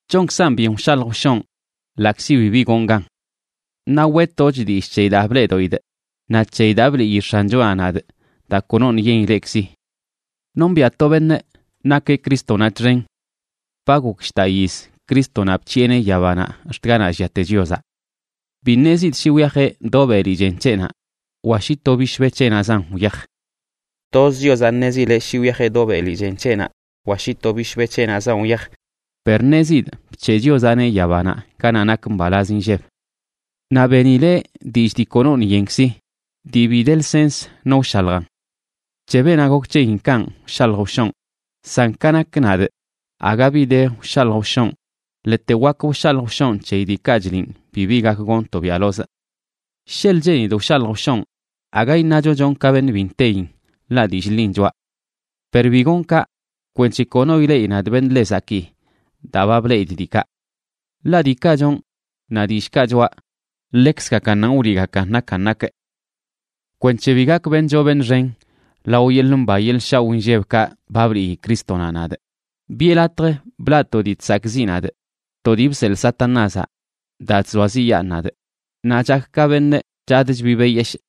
Chonkzan byen wshalj wshonꞌ ḻaꞌkzi bibi gonꞌ gan. Naꞌ weꞌtochꞌ dillꞌ c̱heyi daa bleꞌdoꞌidꞌ naꞌ c̱heyi daa bliꞌyi X̱anchonaꞌ nadꞌ daa konoṉꞌ yen ileꞌkzi. Nombiꞌa to beṉꞌa nakeꞌ Crístonaꞌ txen. Ba gok shdaꞌ yiz Crístonaꞌ bc̱hiꞌeneꞌ yabanaꞌ ax̱t ganaꞌ lliate Chiozaꞌ. Bi ṉezidꞌ shi wyajeꞌ do beli chen c̱heꞌnaꞌ, wa shi to bishbe c̱heꞌnaꞌzan wyaj. Toz Chiozaꞌ ṉezileꞌ shi wyajeꞌ do beli chen c̱heꞌnaꞌ wa shi to bishbe c̱heꞌnaꞌzan wyaj, per ṉezidꞌ bc̱he Chiozaꞌneꞌ yabanaꞌ ganaꞌ nak mbalaz inlleb. Naꞌ benileꞌ dillꞌ dii konoṉꞌ yenkzi, dii bi de lsens no wshaljan. C̱he beenaꞌ gok c̱heyin kanꞌ wshalj wshonꞌ, san ka nak nadꞌ, aga bi de wshalj wshonꞌ ḻete wak wshalj wshonꞌ c̱heyi diikaꞌ chliꞌn bibi gak gonꞌ tobiaꞌlozꞌ. Sheḻꞌ cheenidꞌ wshalj wshonꞌ, aga iṉacho chonꞌ ka beṉꞌ bi nteyin, ḻaꞌ dillꞌ ḻin choꞌa. Per bi gonꞌ kaꞌ, kwenc̱he kono ileꞌi nadꞌ beṉꞌ ḻe zakii daa ba bleꞌidꞌ diikaꞌ. Ḻaꞌ diikaꞌ chonꞌ naꞌ dillꞌkaꞌ choꞌa, ḻekzgakannanꞌ wliꞌgakan nakan nakꞌ. Kwenc̱he bi gakꞌ beṉꞌ choo beṉꞌ xen lao yeḻꞌ mba yeḻꞌ shaoꞌ inllebkaꞌ ba bliꞌyi Crístonaꞌ nadꞌ, biꞌe latj blaꞌ to dii chzakꞌziꞌ nadꞌ, to dii bseḻꞌ Satanázaꞌ daa chzoaziꞌyaan nadꞌ, naꞌ chakꞌ ka beṉꞌ chadꞌ chbibeꞌ yeshꞌ.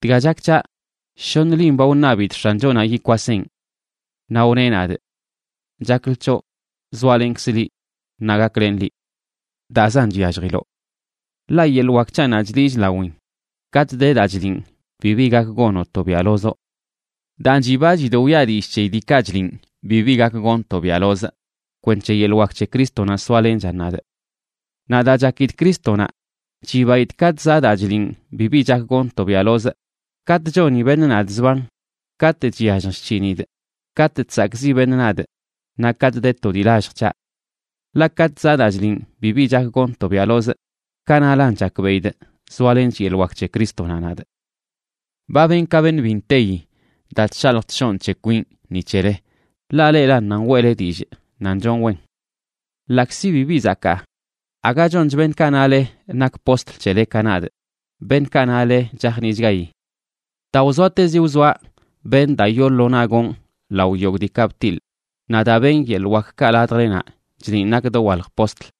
Dga chak c̱haꞌ, shoṉ lin ba wṉabidꞌ X̱anchonaꞌ yikwaseꞌn. Naꞌ wneꞌ nadꞌ: “Chaklə c̱hoꞌ zoalenkzꞌ liꞌ naꞌ gaklenꞌ liꞌ. Daazan chyalljiloꞌ. Ḻaꞌ yeḻꞌ wak c̱haꞌnaꞌ chliꞌch lawin katꞌ de daa chliꞌn bibi gak gonoꞌ tobiaꞌlozoꞌ.” Daan, chibachidꞌ wiꞌa dillꞌ c̱heyi diikaꞌ chliꞌn bibi gak gonꞌ tobiaꞌlozꞌ, kwenc̱he yeḻꞌ wak c̱he Crístonaꞌ soalenchan nadꞌ. Naꞌ daa chakidꞌ Crístonaꞌ, chibaidꞌ katꞌ zaꞌ daa chliꞌn bibi chak gonꞌ tobiaꞌlozꞌ, katꞌ choni beṉꞌ nadꞌ zban, katꞌ chyallj chc̱hinidꞌ, katꞌ chsakꞌziꞌ beṉꞌ nadꞌ, naꞌ katꞌ de to dii lallj c̱haꞌ. Ḻaꞌ katꞌ zaꞌ daa chliꞌn bibi chak gonꞌ tobiaꞌlozꞌ, kanaꞌlan chakbeꞌidꞌ zoalench yeḻꞌ wak c̱he Crístonaꞌ nadꞌ. Ba benꞌ ka beṉꞌ bi nteyi daa chshalj chshonꞌ c̱he kwinꞌ ni c̱hele, ḻaꞌ leꞌlan nan weꞌle dillꞌ nan chonꞌ wen. Ḻaꞌkzi bibi zakaa, aga chonch beṉꞌkaꞌ nale nak postl c̱hele ka nadꞌ, beṉꞌkaꞌ nale chajniꞌchgayi. Daa wzoatezi wzoaꞌ benꞌ daa yoo lo naꞌ gonꞌ lao yogꞌ diikaꞌ btiḻꞌ naꞌ daa benꞌ yeḻꞌ wakkaꞌ ladjlenaꞌ, chliꞌn nakꞌ dowalj postl.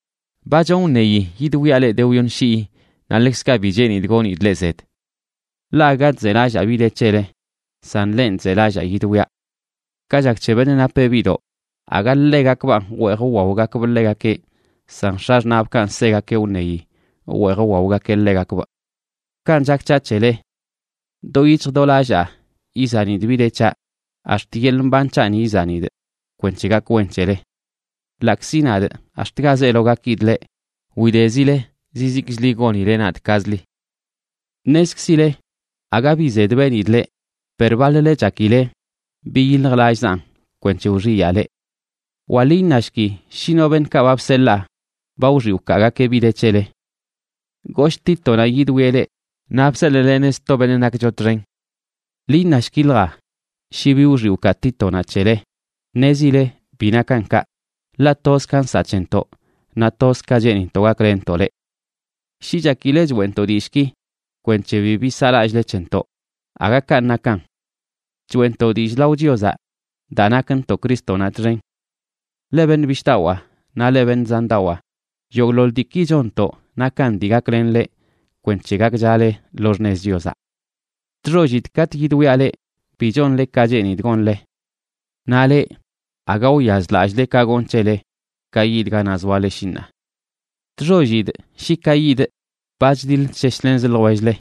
Ba chonꞌ wṉeyi yidwiaꞌ leꞌ de wyoṉ shii, naꞌ ḻekzkaꞌ bi cheenidꞌ gonidꞌ leꞌ zed. Ḻaꞌ aga chzelallaa bi de c̱hele, san lenꞌ chzelallaa yidwiaꞌ. Ka chak c̱he beṉꞌ napeꞌ biꞌdoꞌ, aga ḻegakbanꞌ wweej wwaogakbꞌ ḻegakeꞌ, san x̱axṉaꞌbꞌkanꞌ segakeꞌ wṉeyi wweej wwaogakeꞌ ḻegakbꞌ. Kanꞌ chak c̱haꞌ c̱hele. Do yic̱hj do lallaa izanidꞌ bi de c̱haꞌ, ax̱t yeḻꞌ mban c̱haꞌni izanidꞌ, kwenc̱he gak wen c̱hele. Ḻaꞌkzi nadꞌ ax̱t ga zeelo gakidꞌ leꞌ, widezile zizikchli gonile nadꞌ kazli. Ṉezkzile aga bi zed benidꞌ leꞌ, per baḻ-le chakileꞌ biyiljlallꞌzanꞌ kwenc̱he wxiyaa leꞌ. Wa ḻi iṉashki shi no beṉꞌkaꞌ ba bseḻaa ba wxiꞌ wkaagakeꞌ bi de c̱hele. Goshꞌ Títonaꞌ yidwieꞌ leꞌ, naꞌ bseḻꞌlenee sto beṉꞌ nakcho txen. Ḻi iṉashkilja shi bi wxiꞌ wkaa Títonaꞌ c̱hele. Ṉezile bi nakan kaꞌ. Ḻaꞌ toz ka nsaꞌ c̱hentoꞌ naꞌ toz ka cheenintoꞌ gaklenntoꞌ leꞌ. Shi chakileꞌ choeꞌntoꞌ dillꞌki kwenc̱he bibi saꞌlallꞌle c̱hentoꞌ, aga kanꞌ nakan. Choeꞌntoꞌ dillꞌ lao Chiozaꞌ daa nakntoꞌ Crístonaꞌ txen. Leꞌ beṉꞌ bishꞌdawaa naꞌ leꞌ beṉꞌ zandawaa, yogꞌḻoḻ diiki chonntoꞌ nakan dii gaklen leꞌ kwenc̱he gakchale lo xṉez Chiozaꞌ. Chxollidꞌ katꞌ yidwiaꞌ leꞌ bi chonle ka cheenidꞌ gonle. Naꞌ leꞌ, aga wyazlallꞌle ka gonꞌ c̱hele ka yidꞌ ganaꞌ zoale shi ṉaa. Chxollidꞌ shi ka yidꞌ ba chdiḻ chsheshlenz ljwell-le,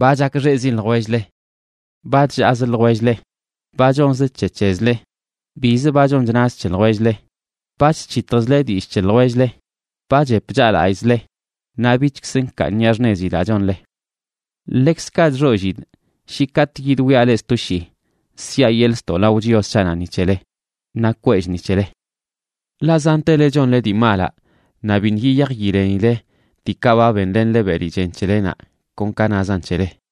ba chakxeꞌzi ljwell-le, ba chllaaz ljwell-le, ba chonz c̱he c̱hezle, bizə ba chon chnaz c̱he ljwell-le, ba chc̱hitjzle dillꞌ c̱he ljwell-le, ba chep chaꞌlallꞌzle, naꞌ bichkzə nkaaniꞌa xṉezi daa chonle. Ḻekzkaꞌ chxollidꞌ shi katꞌ yidwiaꞌ leꞌ sto shii, siꞌa yeḻꞌ ztoꞌ lao Chios c̱haꞌnaꞌ ni c̱hele, naꞌ kwellꞌ ni c̱hele. Ḻaꞌ zantele chonle dii malaꞌ, naꞌ biṉꞌ yiyaj yilenile diikaꞌ ba benlenle beli chen c̱helenaꞌ kon ka nazan c̱hele.